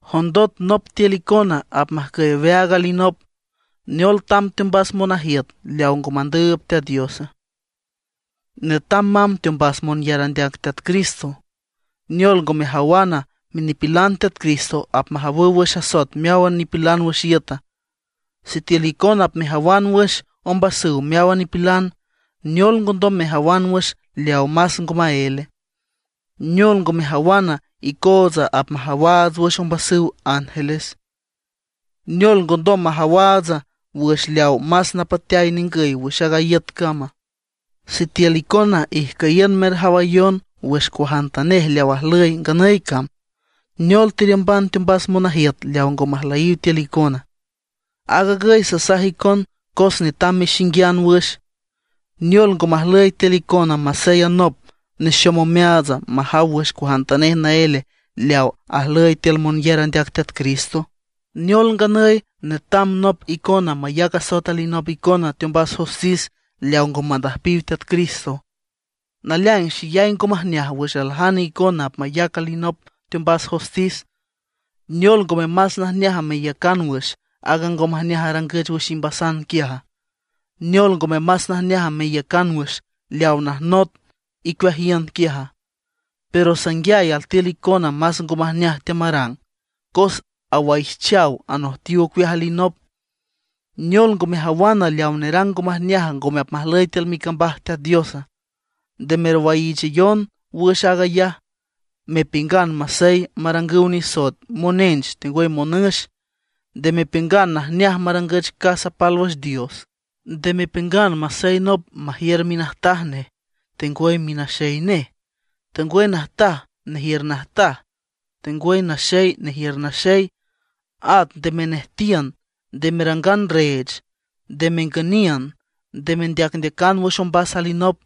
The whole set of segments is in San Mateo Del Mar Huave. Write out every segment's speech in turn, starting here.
¿Jondot nop tiül icona apmajcüy aweaag alinop, neol tamb teombas monajiüt leaw ngo mandüüb Teat Diosa? Netam mamb teombas monyar andeac Teat Cristo. ¿Neol ngo mejawana, minipilan Teat Cristo apmajawüw wüx asoet meáwan nipilan wüx iüta? Sitiül icona apmejawan wüx ombasüw meáwan nipilan, ¿neol ngondom mejawan wüx leaw más ngo maéle? ¿Neol ngo mejawana, icootsa apmajawaats wüx ombasüw ángeles? ¿Neol ngondom majawaats wüx leaw más napateay ningüy wüx a iüt cama? Sitiül icona ijcüyiün merjawayon wüx cuajantanej leaw ajlüy nganüy cam; ¿neol teriümban teombas monajiüt leaw ngo majlüyiw tiül icona? Aag agüy sasaj icon cos netam mexinguian wüx. ¿Neola, ngo majlüy tiül icona masey anop nexom omeaatsa, majaw wüx cuajantanej naél leaw ajlüy tiül monyar andeac Teat Cristo? ¿Neol nganüy netam nop icona mayac asoet alinop icona teombas jostis leaw ngo mandüjpiw Teat Cristo? Naleaing xeyay ngo majneaj wüx aljane icona apmayac alinop teombas jostis. ¿Neol ngome más najneaj meiücan wüx aaga ngo majneaj arangüch wüx imbasan quiaja? ¿Neol ngome más najneaj meiücan wüx leaw najnot icueajiün quiaja? Pero sanguiay altiül icona más ngo majneaj teamarang, cos awaijchaw y anojtiw ocueaj alinop. ¿Neol ngo mejawana, leaw nerang ngo majneaj ngome apmajlüy tiül micambaj Teat Diosa? Nde merwaiichayon wüx aag ayaj, mepiüngan masey marangüw nisoet monench tengwüy monüx. Nde mepiüngan najneaj marangüch casa pálwüx dios. Nde mepiüngan masey nop majiür minajtaj, tengwüy minaxey, tengwüy najtaj nejiür najtaj, tengwüy naxey nejiür naxey. At nde menejtiün, nde merangan reech, nde mengüniün, nde mendeacndeacan wüx ombas alinop,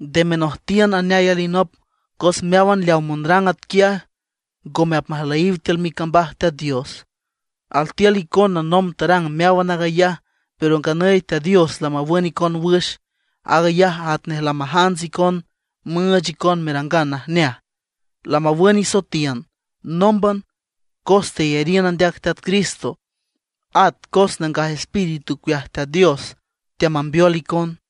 nde menojtiün aneay alinop. Cos meáwan leaw monarang atquiaj, ngome apmajlüyiw tiül micambaj Teat Dios. Altiül icona nomb tarang meáwan aag ayaj, pero nganüy Teat Dios lamawün icon wüx. Aag ayaj atnej lamajants icon müüch icon merangan najneaj. Lamawün isoetiün nómban cos teyariün andeac Teat Cristo, at cos Nangaj Espíritu ocueaj Teat Dios teamambeol icon.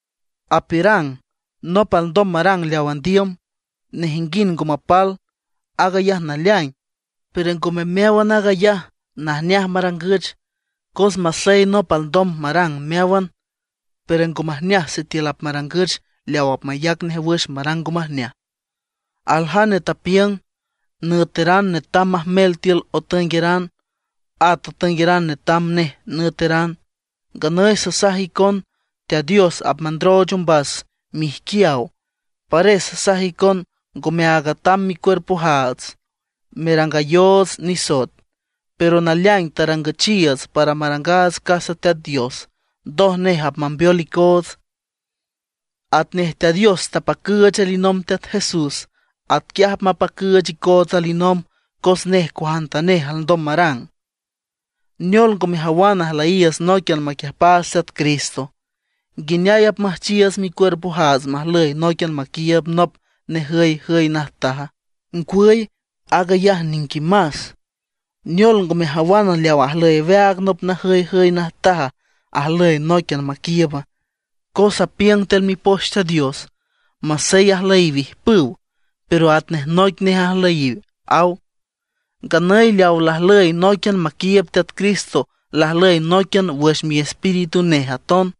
Apiürang: “Nop alndom marang leaw andiüm, nejinguind ngo mapal”. Aag ayaj naleaing, pero ngome meáwan aag ayaj najneaj marangüch. Cos masey nop alndom marang meáwan, pero ngo majneaj sitiül apmarangüch leaw apmayac nej wüx marang ngo majneaj. Aljane tapiüng: “Nüeteran netam majmel tiül otüengueran, at otüengueran netam nej nüeteran”. Nganüy sasaj icon Teat Dios apmandrooch ombas miijquiaw. Pares sasaj icon ngomeaag atam micuerpojaats merangayoots nisoet, pero naleaing tarangüchiiüts para marangaats casa Teat Dios, ndoj nej apmambeol icoots. Atnej Teat Dios tapacüüch alinomb Teat Jesús, atquiaj apmapacüüch icoots alinomb, cos nej cuajantanej alndom marang. ¿Neol ngo mejawana ajlüyiiüts nóiquian maquiüjpaats Teat Cristo? ¿Nguineay apmüjchiiüts micuerpojaats majlüy nóiquian maquiiüb nop najüyjüy najtaja? ¡Ngwüy, aag ayaj niquimas! ¿Neol, ngo mejawana, leaw ajlüy aweaag nop najüyjüy najtaj ajlüy nóiquian maquiiüba? Cos apiüng tiül Mipoch Teat Dios: “Masey ajlüyiw ijpüw, pero atnej noic nej ajlüyiw”, aw. Nganüy leaw lajlüy nóiquian maquiiüb Teat Cristo lajlüy nóiquian wüx miespíritu nej aton.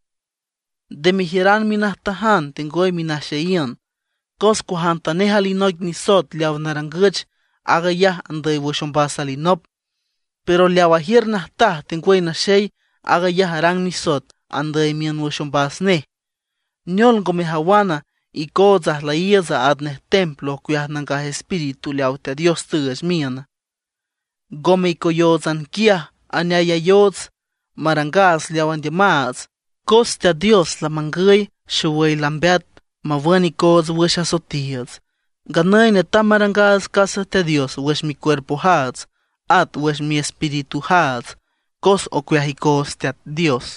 Nde mejiüran minajtajan tengwüy minaxeyiün. Cos cuajantanej alinoic nisoet leawa narangüch, aag ayaj andüy wüx ombas alinop; pero leaw ajiür najtaj tengwüy naxey, aag ayaj arang nisoet andüy miün wüx ombas nej. ¿Neol ngo mejawana, icootsa ajlüyiiüts atnej templo ocueaj Nangaj Espíritu leaw Teat Dios tüüch miüna? Ngome icoyóotsan quiaj aneayayoots, marangaats leaw andiümaats. Cos Teat Dios lamangüy xowüy lambeat mawün icoots wüx asoetiiüts. Nganüy netam marangaats casa Teat Dios wüx micuerpojaats at wüx miespiritujaats, cos ocueaj icoots Teat Dios.